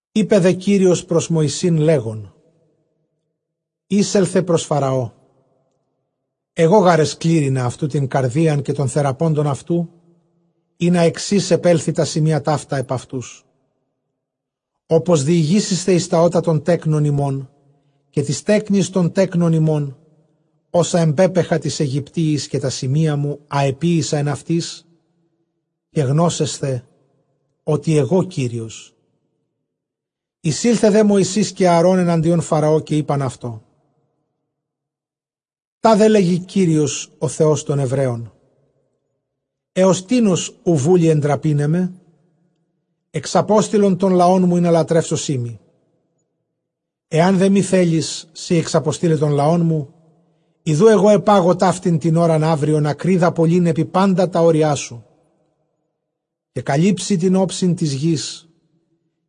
Εἶπε δὲ Κύριος πρὸς Μωυσῆν, λέγων, εἴσελθε πρὸς Φαραὼ, ἐγὼ γὰρ ἐσκλήρυνα αὐτοῦ τὴν καρδίαν καὶ τῶν θεραπόντων αὐτοῦ, ἵνα ἑξῆς ἐπέλθῃ τὰ σημεῖα ταῦτα ἐπʼ αὐτούς· ὅπως διηγήσησθε εἰς τὰ ὦτα τῶν τέκνων ὑμῶν, καὶ τοῖς τέκνοις τῶν τέκνων ὑμῶν, ὅσα ἐμπέπαιχα τοῖς Αἰγυπτίοις, καὶ τὰ σημεῖά μου, ἃ ἐποίησα ἐν αὐτοῖς· καὶ γνώσεσθε ὅτι ἐγὼ Κύριος. Εἰσῆλθε δὲ Μωυσῆς καὶ Ἀαρὼν ἐναντίον Φαραὼ, καὶ εἶπαν αὐτῷ, τάδε λέγει Κύριος ὁ Θεὸς τῶν Ἐβραίων, ἕως τίνος οὐ βούλει ἐντραπῆναί με; ἔξαπόστειλον τὸν λαόν μου, ἵνα λατρεύσωσί μοι. Ἐὰν δὲ μὴ θέλῃς σὺ ἐξαποστεῖλαι τὸν λαόν μου, ἰδοὺ ἐγὼ ἐπάγω ταύτην τὴν ὥραν αὔριον ἀκρίδα πολλὴν ἐπὶ πάντα τὰ ὅριά σου. Καὶ καλύψει τὴν ὄψιν τῆς γῆς,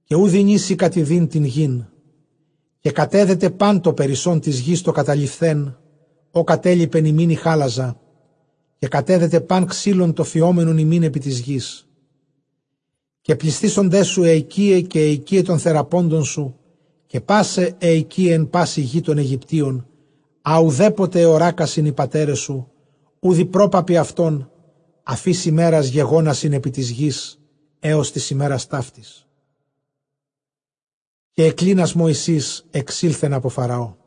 καὶ οὐ δυνήσῃ κατιδεῖν τὴν γῆν· καὶ κατέδεται πᾶν τὸ περισσὸν τῆς γῆς τὸ καταλειφθὲν, ὃ κατέλιπεν ὑμῖν ἡ χάλαζα, καὶ κατέδεται πᾶν ξύλον τὸ φυόμενον ὑμῖν ἐπὶ τῆς γῆς. Καὶ πλησθήσονταί σου αἱ οἰκίαι, καὶ αἱ οἰκίαι τῶν θεραπόντων σου, καὶ πᾶσαι αἱ οἰκίαι ἐν πάσῃ γῇ τῶν Αἰγυπτίων· ἃ οὐδέποτε ἑωράκασιν οἱ πατέρες σου, οὐδʼ οἱ πρόπαπποι αὐτῶν, ἀφʼ ἧς ἡμέρας γεγόνασιν ἐπὶ τῆς γῆς, ἔως τῆς ἡμέρας ταύτης· καὶ ἐκκλίνας Μωυσῆς ἐξῆλθεν ἀπὸ Φαραώ.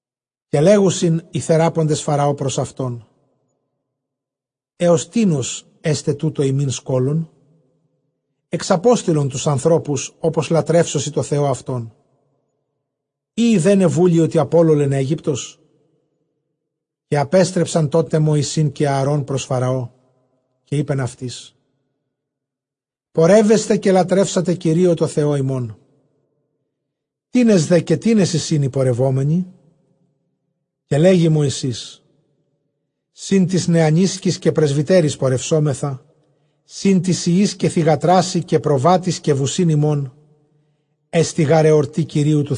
Καὶ λέγουσιν οἱ θεράποντες Φαραὼ πρὸς αὐτὸν, ἕως τίνος ἔσται τοῦτο ἡμῖν σκῶλον; ἐξαπόστειλον τοὺς ἀνθρώπους, ὅπως λατρεύσωσι τῷ Θεῷ αὐτῶν· ἢ εἰδέναι βούλει ὅτι ἀπόλωλεν Αἴγυπτος; Καὶ ἀπέστρεψαν τόν τε Μωυσῆν καὶ Ἀαρὼν πρὸς Φαραὼ, καὶ εἶπεν αὐτοῖς, πορεύεσθε καὶ λατρεύσατε Κυρίῳ τῷ Θεῷ ὑμῶν· τίνες δὲ καὶ τίνες εἰσιν οἱ πορευόμενοι; Καὶ λέγει Μωυσῆς, σὺν τοῖς νεανίσκοις καὶ πρεσβυτέροις πορευσόμεθα, σὺν τοῖς υἱοῖς καὶ θυγατράσι, καὶ προβάτοις, καὶ βουσὶν ἡμῶν· ἔστι γὰρ ἑορτὴ Κυρίου.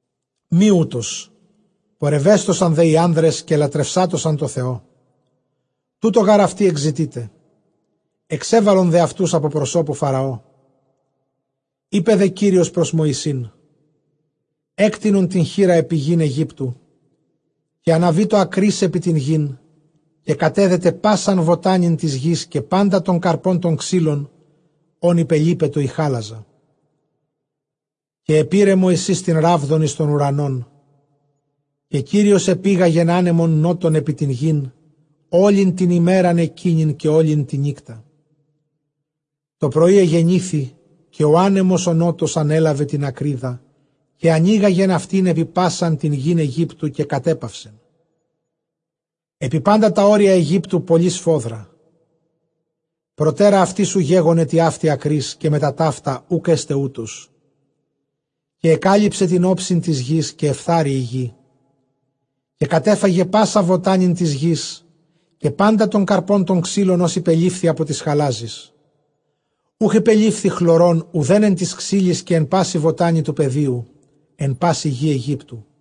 Μὴ οὕτως· πορευέσθωσαν δὲ οἱ ἄνδρες, καὶ λατρευσάτωσαν τῷ Θεῷ· τοῦτο γὰρ αὐτοὶ ἐκζητεῖτε· ἐξέβαλον δὲ αὐτοὺς ἀπὸ προσώπου Φαραώ. Εἶπε δὲ Κύριος πρὸς Μωυσῆν, ἔκτεινον τὴν χεῖρα ἐπὶ γῆν Αἰγύπτου· καὶ ἀναβήτω ἀκρὶς ἐπὶ τὴν γῆν, καὶ κατέδεται πᾶσαν βοτάνην τῆς γῆς, καὶ πάντα τὸν καρπὸν τῶν ξύλων, ὃν ὑπελίπετο ἡ χάλαζα. Καὶ ἐπῇρε Μωυσῆς τὴν ῥάβδον εἰς τὸν οὐρανὸν, καὶ Κύριος ἐπήγαγεν ἄνεμον νότον ἐπὶ τὴν γῆν, ὅλην τὴν ἡμέραν ἐκείνην, καὶ ὅλην τὴν νύκτα· τὸ πρωῒ ἐγενήθη, καὶ ὁ ἄνεμος ὁ νότος ἀνέλαβεν τὴν ἀκρίδα, καὶ ἀνήγαγεν αὐτὴν ἐπὶ πᾶσαν γῆν Αἰγύπτου· καὶ κατέπαυσεν ἐπὶ πάντα τὰ ὅρια Αἰγύπτου πολλὴ σφόδρα· προτέρα αὐτῆς οὐ γέγονε τοιαύτη ἀκρὶς, καὶ μετὰ ταῦτα οὐκ ἔσται οὕτως. Καὶ ἐκάλυψε τὴν ὄψιν τῆς γῆς, καὶ ἐφθάρη ἡ γῆ· καὶ κατέφαγε πᾶσαν βοτάνην τῆς γῆς, καὶ πάντα τόν καρπὸν τῶν ξύλων, ὃς ὑπελείφθη ἀπὸ τῆς χαλάζης· οὐχ ὑπελείφθη χλωρὸν οὐδὲν ἐν τοῖς ξύλοις, καὶ ἐν πάσῃ βοτάνῃ τοῦ πεδίου, ἐν πάσηῃ γῇ Αἰγύπτου.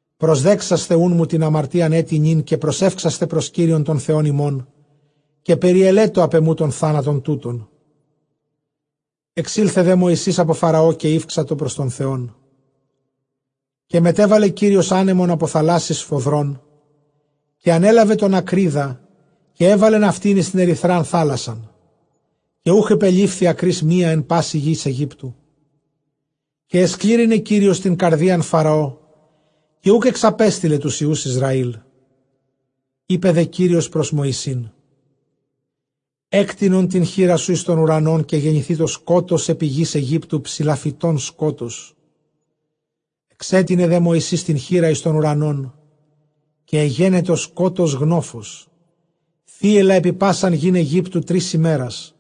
Προσδέξασθε οὖν μου τὴν ἁμαρτίαν ἔτι νῦν, καὶ προσεύξασθε πρὸς Κύριον τὸν Θεὸν ὑμῶν, καὶ περιελέτω ἀπʼ ἐμοῦ τὸν θάνατον τοῦτον. Ἐξῆλθε δὲ Μωυσῆς ἀπὸ Φαραὼ, καὶ ηὔξατο πρὸς τὸν Θεόν. Καὶ μετέβαλε Κύριος ἄνεμον ἀπὸ θαλάσσης σφοδρὸν, καὶ ἀνέλαβε τὴν ἀκρίδα, καὶ ἔβαλεν αὐτὴν εἰς τὴν ἐρυθρὰν θαλάσσαν· καὶ οὐχ ὑπελείφη ἀκρὶς μία ἐν πάσῃ γῇ Αἰγύπτου. Καὶ ἐσκλήρυνε Κύριος τὴν καρδίαν Φαραὼ, καὶ οὐκ ἐξαπέστειλε τοὺς υἱοὺς Ἰσραήλ. Εἶπε δὲ Κύριος πρὸς Μωυσῆν, ἔκτεινον τὴν χεῖρά σου εἰς τὸν οὐρανὸν, καὶ γενηθήτω σκότος ἐπὶ γῆς Αἰγύπτου, ψηλαφητὸν σκότος. Ἐξέτεινε δὲ Μωυσῆς τὴν χεῖρα εἰς τὸν οὐρανόν· καὶ ἐγένετο σκότος γνόφος, θύελλα ἐπὶ πᾶσαν γῆν Αἰγύπτου τρεῖς ἡμέρας·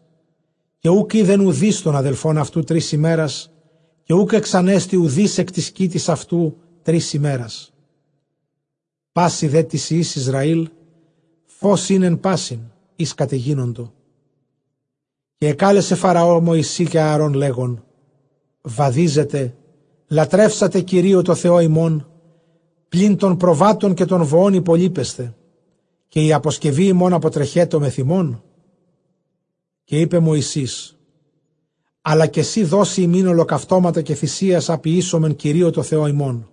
Καὶ οὐκ εἶδεν οὐδεὶς τὸν ἀδελφὸν αὐτοῦ τρεῖς ἡμέρας· καὶ οὐκ ἐξανέστη οὐδεὶς ἐκ τῆς κοίτης αὐτοῦ τρεῖς ἡμέρας· πᾶσι δὲ τοῖς υἱοῖς Ἰσραὴλ φῶς ἦν ἐν πᾶσιν οἷς κατεγίνοντο. Καὶ ἐκάλεσε Φαραὼ Μωυσῆν καὶ Ἀαρὼν, λέγων, Βαδίζετε, λατρεύσατε Κυρίῳ τῷ Θεῷ ὑμῶν, πλὴν τῶν προβάτων καὶ τῶν βοῶν ὑπολείπεσθε· καὶ ἡ ἀποσκευὴ ὑμῶν ἀποτρεχέτω μεθʼ ὑμῶν. Καὶ εἶπε Μωυσῆς, ἀλλὰ καὶ σὺ δώσεις ἡμῖν ὁλοκαυτώματα καὶ θυσίας, ἂ ποιήσομεν Κυρίῳ τῷ Θεῷ ἡμῶν.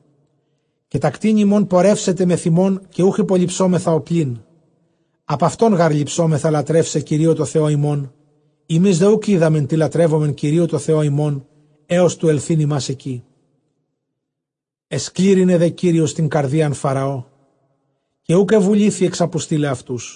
Καὶ τὰ κτήνη ἡμῶν πορεύσεται μεθʼ ἡμῶν, καὶ οὐχ ὑπολειψόμεθα ὁπλήν· ἀπʼ αὐτῶν γὰρ ληψόμεθα λατρεῦσαι Κυρίῳ τῷ Θεῷ ἡμῶν· ἡμεῖς δὲ οὐκ οἴδαμεν τί λατρεύσομεν Κυρίῳ τῷ Θεῷ ἡμῶν, ἕως τοῦ ἐλθεῖν ἡμᾶς ἐκεῖ. Ἐσκλήρυνε δὲ Κύριος τὴν καρδίαν Φαραὼ, καὶ οὐκ ἐβουλήθη ἐξαποστεῖλαι αὐτούς.